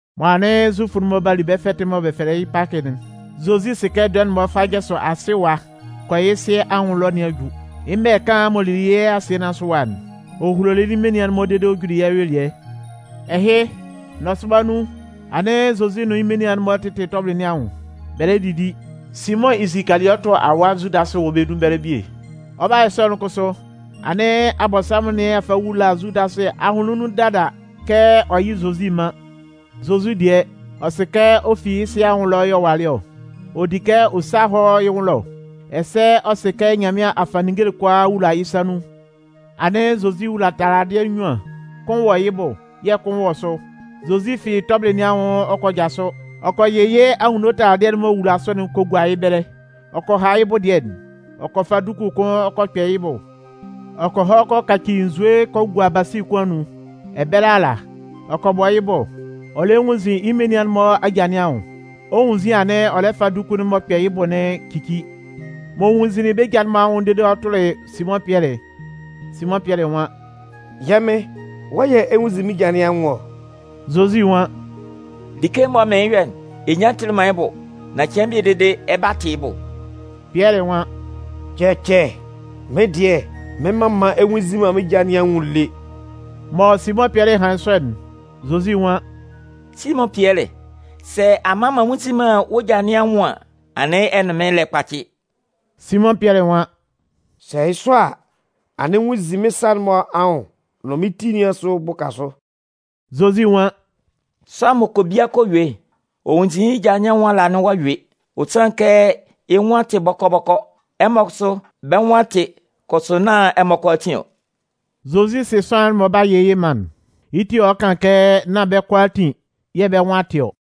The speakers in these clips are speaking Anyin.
Mɔ anɩn Zufʋ'n-mɔ 'ba li bɛ́ fɛtɩ'n mɔ bɛ fɛlɛ yɩ́ Pakɩ'n, Zozi sɩ kɛ dɔɛ'n mɔ ɔ 'fa jasʋ asɩ ɛwa kɔ yɩ́ Sɩ anwʋn ɛlɔ nɩn a ju. Yɩ́ mɛlɛ kaan'n m'ɔ lili yɩ́ asɩɛ nɩn asʋ ɛwa'n, ɔ hulolɩ yɩ́ menian'n-mɔ dede ɔ juli yɩ́ ayuelɩɛ. Ɛhɩ, nɔsʋba nun, anɩn Zozi nʋn yɩ́ menian'n-mɔ lɩla tɔbɩlɩ nɩn anwʋn, bɛ lɛ didi. Simʋn Isikaliɔtɩ awa Zudasɩ wɔ bɛ́ nun ɛbɛlɛ bie. Ɔ 'ba yɔ sɔ'n kʋsʋ, anɩn Abɔnsanmʋn nɩn a fa a wula Zudasɩ ahʋnlɩn nun dada kɛ ɔ yɩ́ Zozi mán. Zozi dɩɛ, ɔ sɩ kɛ ɔ fi yɩ́ Sɩ anwʋn ɛlɔ yɛ̂ ɔ walɩ ɔ, ɔ di kɛ ɔ sá hɔ́ yɩ́ nwʋn ɛlɔ. Ɛsɛ ɔ sɩ kɛ Nyanmɩan a fa ninnge'n kʋalaa a wula yɩ́ sa nun. Anɩn Zozi wula taladɩɛ nnyuan, kʋn wɔ yɩ́ bʋ yɛ̂ kʋn wɔ sʋ. Zozi fi tɔbɩlɩ nɩn anwʋn ɔ kɔ jasʋ, ɔ kɔ yɩ yɩ́ anwunno taladɩɛ'n m'ɔ wula sʋ'n kɔ gua yɩ́ ɛbɛlɛ, ɔ kɔ ha yɩ́ bʋ dɩɛ'n. Ɔ kɔ fa duku kʋn ɔ kɔ kpɛ yɩ́ bʋ. Ɔ kɔ hɔ kɔ kaci nzue kɔ gua basi kʋn anun, ɛbɛlɛ ala, ɔ kɔ bɔ yɩ́ bʋ, ɔ lɛ nwunnzin yɩ́ menian'n-mɔ aja nɩn anwʋn. Ɔ 'nwunnzin anɩn ɔ lɛ fa duku'n m'ɔ kpɛ yɩ́ bʋ'n cici. M'ɔ nwunnzinlin bɛ́ ja'n-mɔ anwʋn dede m'ɔ tʋlɩ Simʋn Pɩɛlɩ'n, Simʋn Pɩɛlɩ nwan: “Yɛ́ Mɩn, wɔ́ yɛ̂ ɛ 'nwunnzin mɩ́n ja nɩn anwʋn ɔ?” Zozi nwan: “Like'n mɔ mɩɩn yɔ'n, ɛ nyan tɩlɩ man yɩ́ bʋ, nan cɩan bie dede ɛ 'ba tɩ yɩ́ bʋ.” Pɩɛlɩ nwan: “Cɛcɛ, mɩ́n dɩɛ mɩn mman ɛ nnwunnzin man mɩ́n ja nɩn anwʋn lé.” Mɔ Simʋn Pɩɛlɩ hanlɩn sɔ'n, Zozi nwan: “Simʋn Pɩɛlɩ, sɛ a mman m'an nnwunnzin man wɔ́ ja nɩn anwʋn an, anɩn ɛ nʋn mɩ́n lɛ kpacɩ.” Simʋn Pɩɛlɩ nwan: “Sɛ yɩ́ sɔ a, anɩn nwunnzin mɩ́n sa'n-mɔ anwʋn nʋn mɩ́n ti nɩn asʋ bʋka sʋ.” Zozi nwan: “Sʋanlan m'ɔ kɔ bia kɔ yue'n, ɔ nwunnzin yɩ́ ja nɩn anwʋn ala anɩn ɔ'a yue, ɔ sanlɩn kɛ yɩ́ nwʋn tɩ bɔkɔ-bɔkɔ. Ɛmɔ kʋsʋ, bɛ́ nwʋn a tɩ, kʋsʋ nán ɛmɔ kʋalaatin ɔ.” Zozi sɩ sʋanlan'n m'ɔ lɛ 'ba yɩ yɩ́ man'n, yɩ́ ti yɛ̂ ɔ lɛ kan kɛ nán bɛ́ kʋalaatin yɛ̂ bɛ́ nwʋn a tɩ ɔ.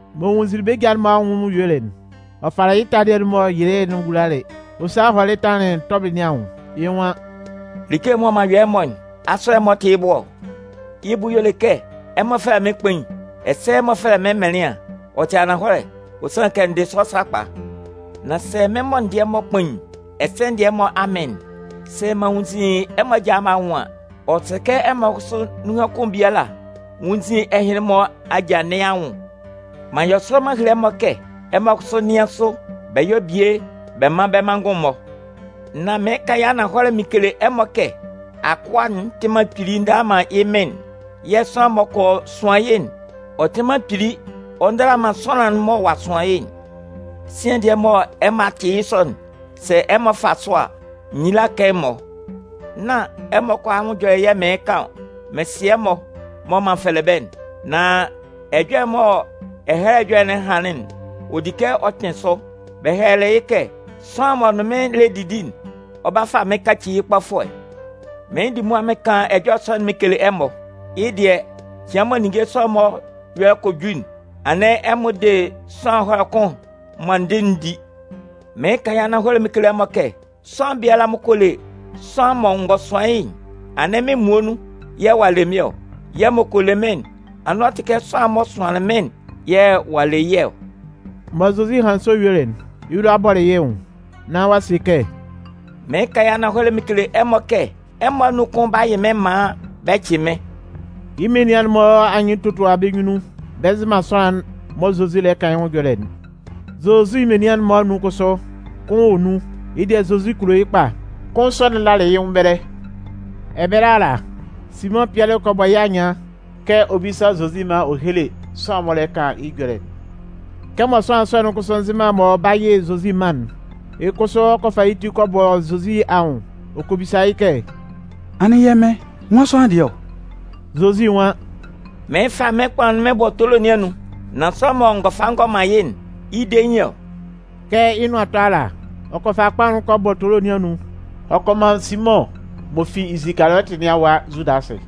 M'ɔ nwunnzinlin bɛ́ ja'n-mɔ anwʋn yuelɩ'n, ɔ falɩ yɩ́ taladɩɛ'n m'ɔ yɩlɩ'n ɔ wulalɩ, ɔ salɩ hɔlɩ lalɩ tɔbɩlɩ nɩn anwʋn. Yɩ́ nwan: “Like'n mɔ m'an yɔ ɛmɔ'n, asʋ ɛmɔ tɩ yɩ́ bʋ ɔ? Yɩ́ bʋ y'ɔ le kɛ, ɛmɔ fɛlɛ mɩ́n Kpain, ɛsɛ ɛmɔ fɛlɛ mɩ́n Mɩnlɩan, ɔ tɩ ananhɔlɛ, ɔ sanlɩn kɛ n dɩ yɩ́ sɔ sakpa. Nan sɛ mɩ́n mɔ n dɩ ɛmɔ kpain, ɛsɛ n dɩ ɛmɔ amɩn'n, sɛ m'an nwunnzin ɛmɔ aja'n-mɔ anwʋn an, ɔ sɛ kɛ ɛmɔ kʋsʋ anun kʋn biala nwúnnzin ɛhɩnlɩn-mɔ aja nɩn anwʋn. M'an yɔ sɔ m'an hele ɛmɔ kɛ ɛmɔ kʋsʋ nɩ́an sʋ bɛ yɔ́ bie bɛ mán bɛ́ manngʋn'n-mɔ. Nan mɩɩn kan yɩ́ ananhɔlɛ mɩn kele ɛmɔ kɛ akʋa'n tɩ man kpili ndala man yɩ́ mɩn'n. Yɛ̂ sʋanlan mɔ bɛ kɔ sʋan yɩ́'n, ɔ tɩ man kpili ɔ ndala man sʋanlan'n m'ɔ sʋanlɩn yɩ́'n. Sian dɩɛ mɔ ɛmɔ a tɩ yɩ́ sɔ'n, sɛ ɛmɔ fa sʋ a, nyila 'kan ɛmɔ. “Nán ɛmɔ kʋalaa anwʋn ɛjɔlɛ yɛ̂ mɩɩn kan ɔ. Mɩn sɩ ɛmɔ mɔ m'an fɛlɛ bɛ́'n. Nan ɛjɔlɛ'n mɔ Ɛhɛlɛ Ɛjɔlɛ'n hanlɩn'n, ɔ di kɛ ɔ kpɩn sʋ. Bɛ hɛlɛlɩ kɛ: Sʋanlan'n m'ɔ nʋn mɩ́n lɛ didi'n, ɔ 'ba fa mɩ́n kaci yɩ́ kpɔfʋɛ. “Mɩɩn di mʋa mɩn kan ɛjɔlɛ sɔ'n mɩn kele ɛmɔ, yɩ́ dɩɛ, cɩan mɔ ninnge sɔ'n-mɔ ɛyɔlɛ kɔ ju'n, anɩn ɛmɔ de sʋanlan ɛhɔlɛ kʋn'n mɔ n dɩ'n di. Mɩɩn kan yɩ́ ananhɔlɛ mɩn kele ɛmɔ kɛ, sʋanlan biala m'ɔ kɔ le sʋanlan mɔ n gɔ sʋan yɩ́'n, anɩn mɩ́n muonun yɛ̂ ɔ'a le mɩ́n ɔ. Yɛ̂ m'ɔ kɔ le mɩ́n'n, anɩn ɔ tɩ kɛ sʋanlan'n m'ɔ sʋanlɩn mɩ́n'n yɛ̂ ɔ'a le yɩ́ ɔ.” Mɔ Zozi hanlɩn sɔ yuelɩ'n, yɩ́ lʋa bɔlɩ yɩ́ nwʋn, nán ɔ'a se kɛ: “Mɩɩn kan yɩ́ ananhɔlɛ mɩn kele ɛmɔ kɛ ɛmɔ anun kʋn 'ba yɩ mɩ́n maan bɛ cɩ mɩ́n.” Yɩ́ menian'n-mɔ anyɩn totua bɛ́ nyunnun, bɛ nzɩ man sʋanlan'n mɔ Zozi lɛ kan yɩ́ nwʋn ɛjɔlɛ'n. Zozi menian'n-mɔ anun kʋsʋ, kʋn wɔ nun, yɩ́ dɩɛ Zozi kulo yɩ́ kpa. Kʋn sɔ'n lalɩ yɩ́ nwʋn ɛbɛlɛ. Ɛbɛlɛ ala, Simʋn Pɩɛlɩ kɔ bɔ yɩ́ anyɩan kɛ ɔ bísa Zozi maan ɔ héle sʋanlan'n m'ɔ lɛ kan yɩ́ ɛjɔlɛ'n. Kɛmɔ sʋanlan sɔ'n kʋsʋ nzɩ man mɔ ɔ 'ba yɩ Zozi man'n, yɩ́ kʋsʋ ɔ kɔ fa yɩ́ ti kɔ bɔ Zozi anwʋn ɔ kɔ bisa yɩ́ kɛ: “Anɩn, Yɛ́ Mɩn, nwan sʋanlan dɩɛ ɔ?” Zozi nwan: “Mɩɩn fa mɩ́n kpaʋn'n mɩn bɔ tolo nɩn anun, nan sʋanlan mɔ n gɔ fa n gɔ man yɩ́'n, yɩ́ dein yɩ́ ɔ.” Kɛ yɩ́ nʋan 'tɔ ala, ɔ kɔ fa kpaʋn'n kɔ bɔ tolo nɩn anun ɔ kɔ man Simʋn m'ɔ fi Isikaliɔtɩ nɩn awa Zudasɩ.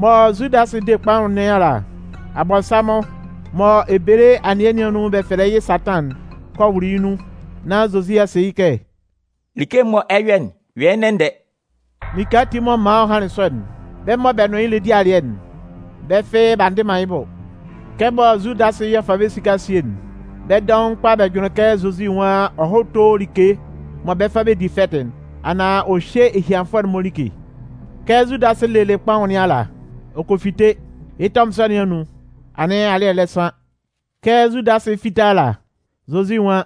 Mɔ Zudasɩ 'de kpaʋn nɩn ala, Abɔnsanmʋn, mɔ ebele anɩɛ nɩn anun bɛ fɛlɛ yɩ́ Satan'n, kɔ wʋlʋ yɩ́ nun. Nán Zozi a se yɩ́ kɛ: “Like'n mɔ ɛ 'yɔ'n, yɔ yɩ́ ndɛ-ndɛ.” Like ati m'ɔ man ɔ hanlɩn sɔ'n, bɛ́ mɔ bɛ nʋn yɩ́ lɛ di alɩɛ'n, bɛ́ fɩ́ɩ́ b'a ndɩ man yɩ́ bʋ. Kɛmɔ Zudasɩ yɛ̂ ɔ fa bɛ́ esika'n sie'n, bɛ́ dɔʋn kpa bɛ jʋnlɩn kɛ Zozi nwan ɔ hɔ́ tó like mɔ bɛ 'fa bɛ di fɛtɩ'n, anaan ɔ hyé ehianfʋɛ'n-mɔ like. Kɛ Zudasɩ lelɩ kpaʋn nɩn ala, ɔ kɔ fite. Yɩ́ tɛmʋn sɔ nɩn anun, anɩn alɩ́ɛ lɛ san. Kɛ Zudasɩ 'fite ala, Zozi nwan: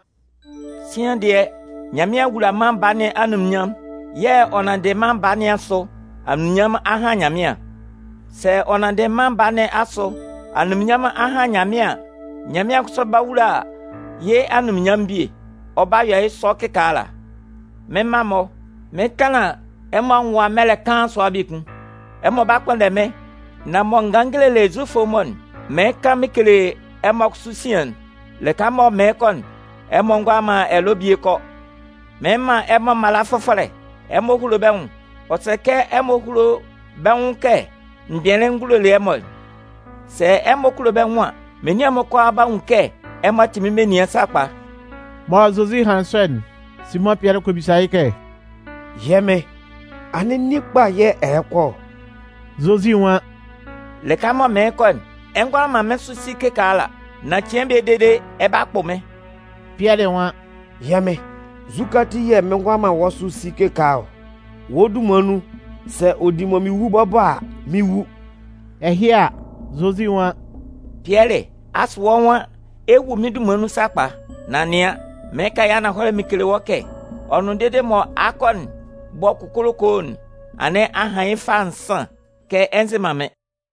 “Sian dɩɛ, Nyanmɩan a wula Mân Baa nɩn anunminnyanmʋn yɛ̂ ɔ nanndɩ Mân Baa nɩn asʋ, anunminnyanmʋn a han Nyanmɩan. Sɛ ɔ nanndɩ Mân Baa nɩn asʋ anunminnyanmʋn a han Nyanmɩan an, Nyanmɩan kʋsʋ 'ba wula yɩ́ anunminnyanmʋn bie. Ɔ 'ba yɔ yɩ́ sɔ kɩkaala. “Mɩ́n mma-mɔ, mɩn 'tanlan ɛmɔ anwʋn ɛwa mɛlɛ kaan sʋa biekun. Ɛmɔ 'ba kpʋnndɛ mɩ́n, nan mɔ n ganlɩn n gelelɩ Zufʋ'n-mɔ, mɩɩn kan mɩn kele ɛmɔ kʋsʋ sian'n. Lɩka mɔ mɩɩn kɔ'n, ɛmɔ ngʋala man ɛlɔ bie kɔ. “Mɩɩn man ɛmɔ mala fʋfɔlɛ: ɛmɔ húlo bɛ́ nwʋn. Ɔ sɛ kɛ ɛmɔ kulo bɛ́ nwʋn kɛ m gbɩnlɩn n gulolɩ ɛmɔ'n. Sɛ ɛmɔ kulo bɛ́ nwʋn an, menian'n-mɔ kʋalaa 'ba nwun kɛ ɛmɔ tɩ mɩ́n menian sakpa.” Mɔ Zozi hanlɩn sɔ'n, Simʋn Pɩɛlɩ kɔ bisa yɩ́ kɛ: “Yɛ́ Mɩn, anɩn nin kpa yɛ̂ ɛ lɛ kɔ ɔ?” Zozi nwan: “Lɩka mɔ mɩɩn kɔ'n, ɛ ngʋala man mɩ́n sʋ si kɩkaala, nan cɩan bie dede ɛ 'ba kpʋ mɩ́n.” Pɩɛlɩ nwan: “Yɛ́ Mɩn, nzukɛ ati yɛ̂ mɩn ngʋala man wɔ́ sʋ si kɩkaala ɔ? Wɔ́ dunman nun, sɛ ɔ di mɔ mɩn wu bɔbɔ a, mɩn 'wu.” Ɛhɩ a, Zozi nwan: “Pɩɛlɩ, asʋ wɔ́ nwan ɛ 'wu mɩ́n dunman nun sakpa? Nan nɩan, mɩɩn kan yɩ́ ananhɔlɛ mɩn kele wɔ́ kɛ ɔ nʋn dede mɔ akɔ'n 'bɔ kokolokoo'n, anɩn a han yɩ́ fâ nsan kɛ ɛ nzɩ man mɩ́n.”